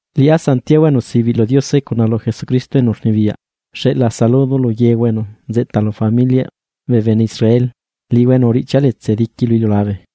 Liꞌá Santiago, enu sibiꞌ lu Diose cuna lu Jesucristo enu rnibiyaꞌ, xeꞌlaa saludo lu yehua enu nzeꞌta lu familiaꞌ bee bene Israel liꞌihua enu uriꞌchia letse diqui lu iliulabe.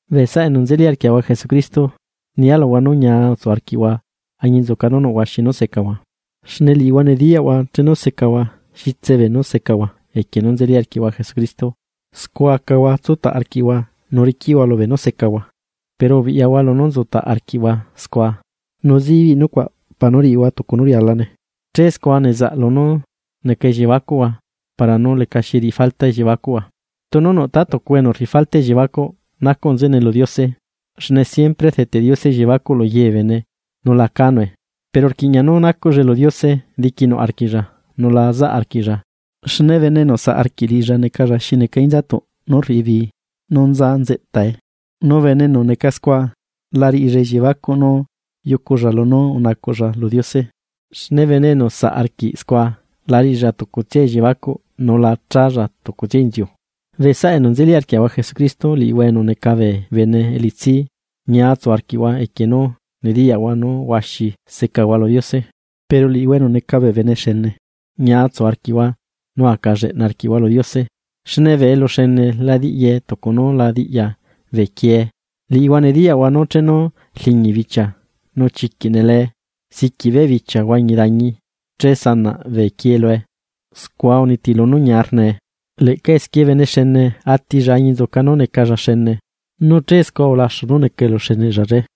Bee saꞌa enu nzeli arquiaꞌahua Jesucristo, nialuhua nú ñia utsu arquiꞌhua añinzuca nú nuꞌ huaxi nú secahua. Xne liꞌihua nediyaꞌhua chenu secahua xitse beenú secahua equie nú nzeli arquiꞌhua Jesucristo, scua acahua tsutaꞌ arquiꞌhua nu riquiꞌhua lu beenú secahua. Pero ubiꞌyahua lunú utsutaꞌ arquiꞌhua scua, nu zibiꞌ nucuaꞌ para nú riꞌihua tucu nú rialane, che scua nezaꞌ lunú neca elliebacuꞌhua para nú lecaxi riꞌi falta elliebacuꞌhua. Tunu nuꞌ tátucuhua enu rriꞌi falta elliebacuꞌ, nacuꞌ nzeꞌene lu Diose, xne siempre rdeteꞌ Diose elliebacuꞌ lu ye bee bene nu la cánue. Pero rquiꞌña nú nacuꞌllae lu Diose diquinuꞌ arquiꞌlla nu la zaꞌ arquiꞌlla, xne bene enu saꞌ arquiꞌ liꞌilla necalla xi neca inzatuꞌ nú rriꞌi bii nú nza nzeꞌta. Nu bene enu neca scua, la riꞌilla elliebacuꞌ nú yuculla lunú unacuꞌlla lu Diose. Xne bene enu saꞌ arquiꞌ scua, la riꞌilla tucutsia elliebacuꞌ nu la challa tucutsia inziu. Bee saꞌa enu nzeli arquiaꞌahua Jesucristo, liꞌihua enu neca bee bene elitsi, ñia utsu arquiꞌhua equie nú nediyaꞌhua nú huaxi secahua lu Diose. Pero liꞌihua enu neca bee bene xene, ñia utsu arquiꞌhua nu aca lleꞌna arquiꞌhua lu Diose. Xne bee eluxene la diꞌyae tucu nú la diꞌya bee quiee. Liꞌihua nediyaꞌhua nú chenu rliñi bichia nu chiquiꞌ nelee siquiꞌ beꞌ bichia huañi dañi, che sanaꞌ bee quie lue, scua unitilu nú ñia rnae. Leꞌca esquie bene xene atilla añinzuca nú necalla xene, nu che scua ulaxu nú neca eluxeneꞌlla.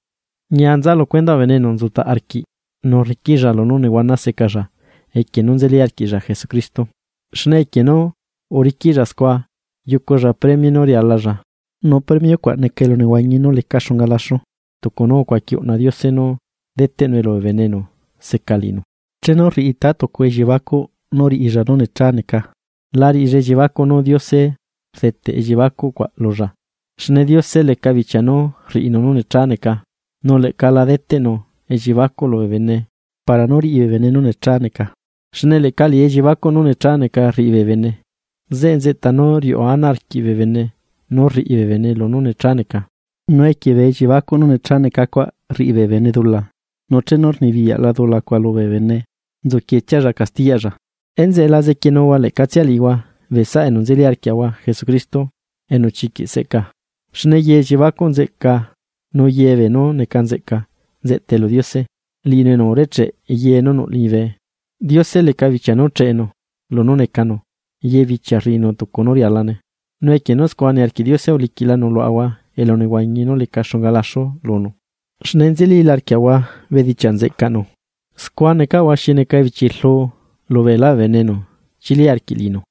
Ñia nza lu cuendaꞌ bene enu nzutaꞌ arquiꞌ nu rriquiꞌlla lunú nehuana secalla equie nú nzeli arquiꞌlla Jesucristo. Xne equie nú uriquiꞌlla scua yuculla premio nú rialalla, nu premio cuaꞌ neca elunehuañi nú leca xunga laxu tucu nú ucuaqui uꞌna Diose nú deteꞌnu lubee bene enu seca liꞌinu. Chenu rriꞌi taa tucuhua elliebacuꞌ nú riꞌilla nú necha neca, la riꞌilla elliebacuꞌ nú Diose rdeteꞌ elliebacuꞌ cuaꞌ lulla, xne Diose leca bichia nú rriꞌinu nú necha neca, nú leꞌca la deteꞌnu elliebacuꞌ lubee bene para nú riꞌi bee bene nú necha neca. Xne leꞌca liꞌi elliebacuꞌ nú necha neca rriꞌi bee bene, zeꞌe nzeꞌta nú riuꞌu ana arquiꞌ bee bene nú rriꞌi bee bene lunú necha neca. Nu equie bee elliebacuꞌ nú necha neca cuaꞌ rriꞌi bee bene dula, nu chenu rnibiyaꞌla dula cuaꞌ lubee bene, nzuquietsialla castiyaꞌlla. Enzeꞌe la zequienuhua leꞌcatsia liꞌihua bee saꞌa enu nzeli arquiaꞌahua Jesucristo, enu chiquiꞌ seꞌca. Xne ye elliebacuꞌ nzeꞌca nu ye beenú neca nzeꞌca nzeꞌta lu Diose, liꞌinu enu urecheꞌe ye nú nuꞌ liñibe. Diose leca bichia nú cheꞌenu lunú necanu, ye bichia rriꞌinu tucu nú rialane. Nu equie nú scua niarquiꞌ Diose, uliquiꞌlanu luaꞌahua elunehuañi nú leca xunga laxu lunu, xne nzelila arquiaꞌahua bedichiaꞌ nzeꞌcaꞌnu, scua necaꞌahua xi neca ebichi rlu lu beelá bee bene enu chili arquiꞌ liꞌinu.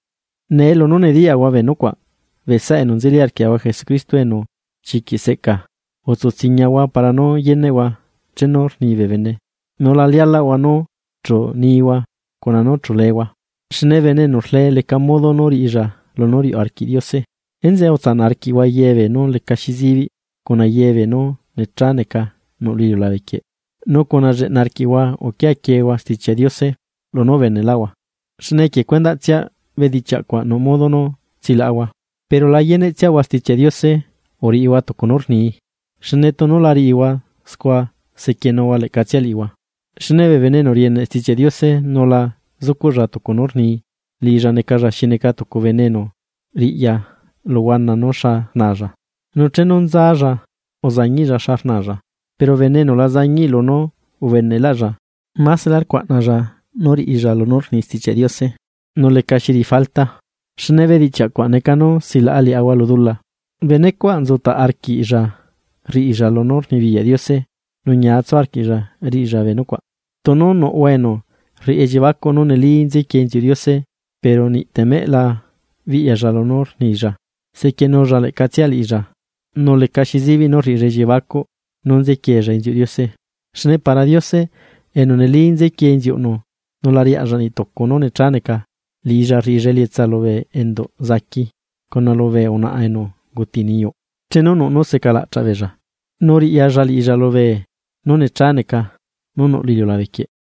Nee lunú nediyaꞌahua bee nucuaꞌ, bee saꞌa enu nzeli arquiaꞌahua Jesucristo enu chiquiꞌ seꞌcaa, utsu tsiñahua para nú yeneꞌhua chenu rni bee bene, nu la lialaꞌhua nú chu nihua cuna nú chu leehua. Xne bene enu rlee leca modo riꞌilla lunú riuꞌ arquiꞌ Diose. Enzeꞌe utsanaꞌ arquiꞌhua ye beenú lecaxi zibiꞌ, cuna ye beenú necha neca nuꞌ lu iliulabe quieꞌ, nu uriꞌi lleꞌnahua arquiꞌhua uquia quiehua Stichiaꞌ Diose nú ubenelaꞌhua, xne equie cuendaꞌtsia bedichiaꞌ cuaꞌ nuꞌ modo nú tsilaꞌahua. Pero la yeneꞌ tsiahua Stichiaꞌ Diose uriꞌihua tucu nú rnii, xne tunu la riꞌihua scua sequienuhua leꞌcatsia liꞌihua. Xne bee bene enu rieneꞌtsia Stichiaꞌ Diose nu la zucuꞌlla tucu nú rnii, liꞌilla necalla xi neca tucu bene enu riꞌya lu huana nú xa rnaalla. Nu chenu nzalla uzañiꞌlla xa rnaalla. Pero bene enu la zañiꞌ lunú ubeneꞌlaꞌlla, máselá rcuaꞌnalla nú riꞌilla lunú rni Stichiaꞌ Diose nu lecaxi riꞌi falta, xne bedichiaꞌ cuaꞌ neca nú silaꞌa liaꞌahua lu dula. Benecuaꞌ nzutaꞌ arquiꞌlla rriꞌilla lunú rnibiyaꞌ Diose, nu ñia tsu arquiꞌlla riꞌilla bee nucuaꞌ. Tunu nuꞌhua enu rriꞌi elliebacuꞌ nú neli nzequiee inziuꞌ Diose, pero niꞌtemeꞌ la biꞌyalla lunú rnilla, sequienulla leꞌca tsia liꞌilla nu lecaxi zibiꞌ nú rriꞌilla elliebacuꞌ nú nzequiella inziuꞌ Diose che. Xne para Diose, enu neli nzequie inziuꞌnu nu la riaꞌlla niꞌ tucu nú necha neca, liꞌilla rriꞌilla elietsa lubee enduꞌ zaqui, cuna lubee unaꞌa enu unguti niyuꞌ chenu nuꞌ nú seca laꞌchaꞌ beella, nu riꞌyalla liꞌilla lu beenú necha neca, nú nuꞌ lu iliulabequieꞌ.